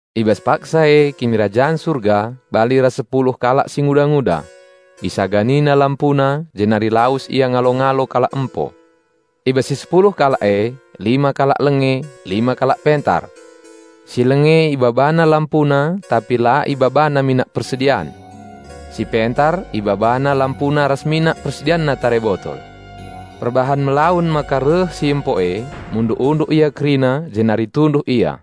"I bas paksa e Kinirajan Surga bali ras sepuluh kalak singuda-nguda. Isaganina lampuna jenari lawes ia ngalo-ngalo kalak empo. I bas si sepuluh kalak e, lima kalak lenge, lima kalak pentar. Si lenge ibabana lampuna tapi la ibabana minak persedian; si pentar ibabana lampuna ras minak persedianna tare botol. Perbahan melawen maka reh si empo e, munduk-unduk ia kerina jenari tunduh ia.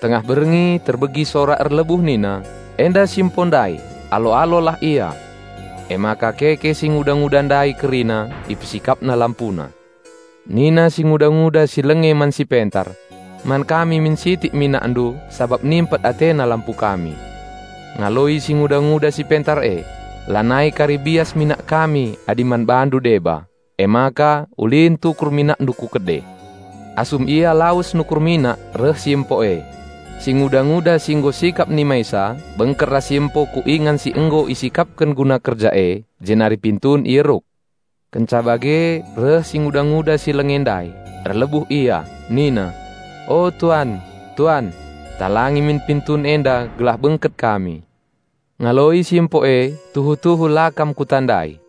Tengah berngi terbegi sora erlebuh nina, 'Enda si empo ndai! Alo-alolah ia!' Emaka keke singuda-nguda ndai kerina, ipesikapna lampuna. Nina singuda-nguda si lenge man si pentar, 'Man kami min sitik minakndu sabap nimpet atena lampu kami.' Ngaloi singuda-nguda si pentar e, 'Lanai kari bias minak kami adi man bandu deba, emaka ulin tukur minakndu ku kede.' Asum ia lawes nukur minak reh si empo e. Singuda-nguda si nggo sikap nimaisa bengket ras si empo ku ingan si nggo isikapken guna kerja e, jenari pintun ieruk. Kenca bage reh si nguda-nguda si lenge ndai, erlebuh ia, nina, 'O tuan, tuan! Talangi min pintun enda gelah bengket kami.' Ngaloi si empo e, 'Tuhu-tuhu la kam kutandai.'"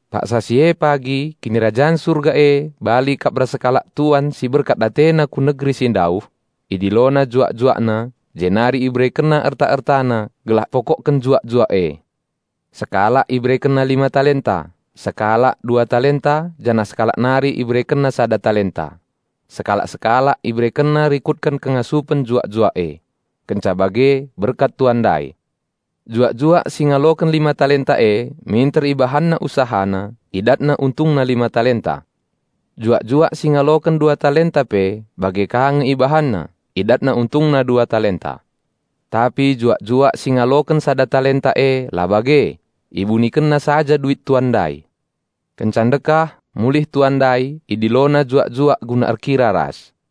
"Paksa si e pagi, Kinirajan Surga e bali kap ras sekalak tuan si berkat atena ku negeri si ndauh. Idilona juak-juakna jenari iberekenna erta-ertana gelah ipokokken juak-juak e. Sekalak iberekenna lima puluh ribu duit emas, sekalak dua puluh ribu duit emas janah sekalak nari iberekenna sepuluh ribu duit emas; sekalak-sekalak iberekenna rikutken kengasupen juak-juak e. Kenca bage berkat tuan ndai. Juak-juak si ngaloken lima puluh ribu duit emas e minter ibahanna usahana; idatna untungna lima puluh ribu duit emas. Juak-juak si ngaloken dua puluh ribu duit emas pe bage ka nge ibahanna; idatna untungna dua puluh ribu duit emas. Tapi juak-juak si ngaloken sepuluh ribu duit emas e la bage; ibunikenna saja duit tuan ndai. Kenca ndekah, mulih tuan ndai, idilona juak-juak guna erkira ras.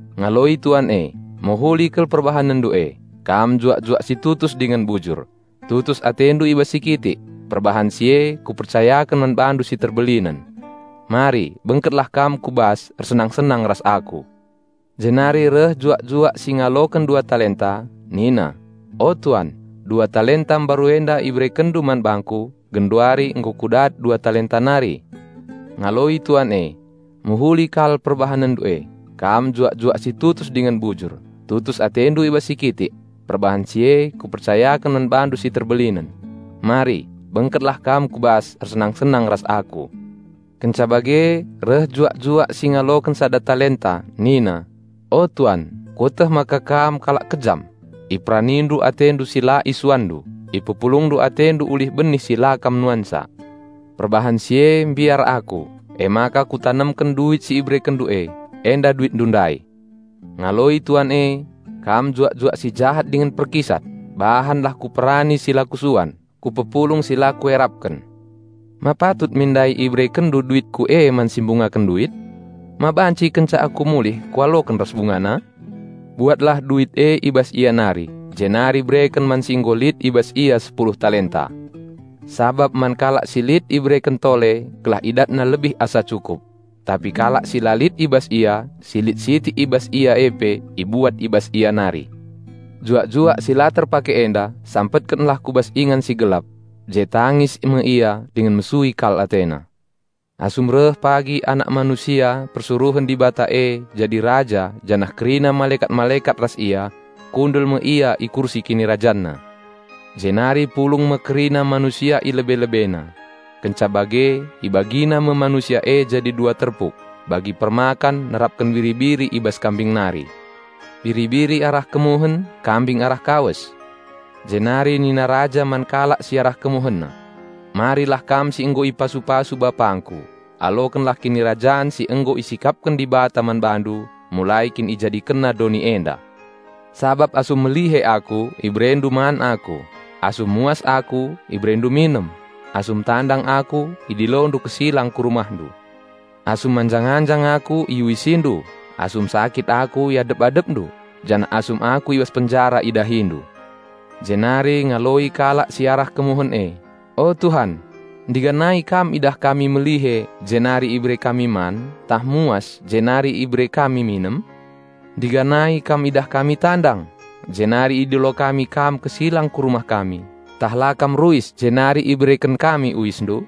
Ngaloi tuan e, 'Mehuli kal perbahanenndu e. Kam juak-juak si tutus dingen bujur; tutus atendu i bas si kitik, perbahan si e kupercayaken man bandu si terbelinen. Mari bengketlah kam ku bas, ersenang-senang ras aku.' Jenari reh juak-juak si ngaloken dua puluh ribu duit emas, nina, 'O tuan, dua puluh ribu duit emas mbaru enda iberekenndu man bangku; genduari nggo kudat dua puluh ribu nari.' Ngaloi tuan e, 'Mehuli kal perbahanenndu e. Kam juak-juak si tutus dingen bujur; tutus atendu i bas si kitik, perbahan si e kupercayaken man bandu si terbelinen. Mari bengketlah kam ku bas ersenang-senang ras Aku.' Kenca bage reh juak-juak si ngaloken sepuluh ribu duit emas nina, 'O Tuan, kueteh maka Kam kalak kejam. IperaniNdu AteNdu si la IsuanNdu, ipepulungndu AteNdu ulih benih si la Kam nuansa. Perbahan si e mbiar aku, emaka kutanemken duit si IberekenNdu e. Enda DuitNdu ndai.' Ngaloi tuan e, 'Kam juak-juak si jahat dingen perkisat. Bahanlah kuperani si la kusuan, kupepulung si la kuerapken, ma patut min ndai iberekenndu duitku e man si mbungaken duit? Ma banci kenca aku mulih kualoken ras bungana? Buatlah duit e i bas ia nari, jenari bereken man si nggo lit i bas ia seratus ribu duit emas. Sabap man kalak si lit ibereken tole gelah idatna lebih asa cukup; tapi kalak si la lit i bas ia, si lit sitik i bas ia e pe ibuat i bas ia nari. Juak-juak si la terpake enda sampetkenlah ku bas ingan si gelap; je tangis me ia dingen mesui kal atena.'" "Asum reh pagi Anak Manusia persuruhen Dibata e jadi Raja janah kerina malekat-malekat ras Ia, kundul me Ia i kursi KinirajanNa. Jenari pulung me kerina manusia i lebe-LebeNa. Kenca bage IbagiNa me manusia e jadi dua terpuk, bagi permakan nerapken biri-biri i bas kambing nari; biri-biri arah kemuhen, kambing arah kawes. Jenari nina Raja man kalak si arah KemuhenNa, 'Marilah kam si nggo ipasu-pasu BapangKu; alokenlah Kinirajan si nggo isikapken Dibata man bandu mulai kin IjadikenNa doni enda. Sabap asum melihe Aku iberendu man Aku, asum muas Aku iberendu minem; asum tandang Aku idilondu kesilang ku rumahndu, asum manjang-anjang Aku iuisindu, asum sakit Aku iadep-adependu, janah asum Aku i bas penjara idahindu.' Jenari ngaloi kalak si arah kemuhen e, 'O Tuhan, ndiganai Kam idah kami melihe jenari ibere man kami, tah muas Jenari ibere minem kami? Ndiganai Kam idah kami tandang Jenari idilo kami Kam kesilang ku rumah kami, ntah la Kam ruis jenari ibereken kami uisndu?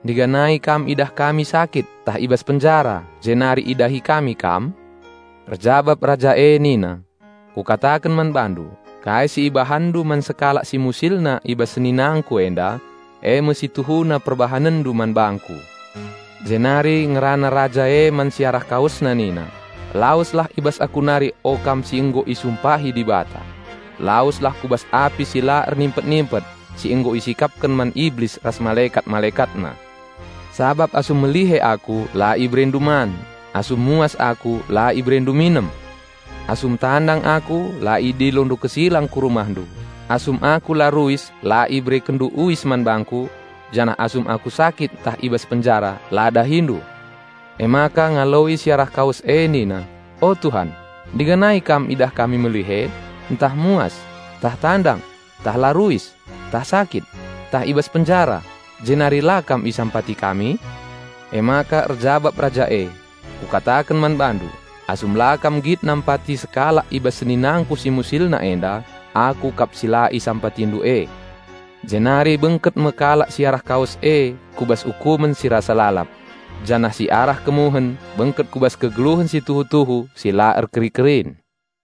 Ndiganai Kam idah kami sakit ntah i bas penjara jenari idahi kami Kam?' Erjabap Raja e nina, 'Kukataken man bandu: Kai si ibahanndu man sekalak si musilna i bas seninangKu enda, eme si tuhuna perbahanenndu man bangKu.' Jenari ngerana Raja e man si arah KawesNa nina, 'Laweslah i bas Aku nari o kam si nggo isumpahi Dibata! Laweslah ku bas api si la ernimpet-nimpet si nggo isikapken man Iblis ras malekat-malekatna! Sabap asum melihe Aku la iberendu man, asum muas Aku la iberendu minem. Asum tandang Aku la idilondu kesilang ku rumahndu, asum Aku la ruis la iberekenndu uis man bangKu; janah asum Aku sakit ntah i bas penjara la dahindu.' Emaka ngaloi si arah kawes e nina, 'O Tuhan, ndiganai Kam idah kami melihe, ntah muas, ntah tandang, ntah la ruis, ntah sakit, ntah i bas penjara, jenari la Kam isampati kami?' Emaka erjabap Raja e, 'Kukataken man bandu: Asum la kam nggit nampati sekalak i bas seninangKu si musilna enda, Aku kap si la isampatindu e.' Jenari bengket me kalak si arah kawes e ku bas ukumen si rasa lalap; janah si arah kemuhen bengket ku bas kegeluhen si tuhu-tuhu si la erkeri-kerin."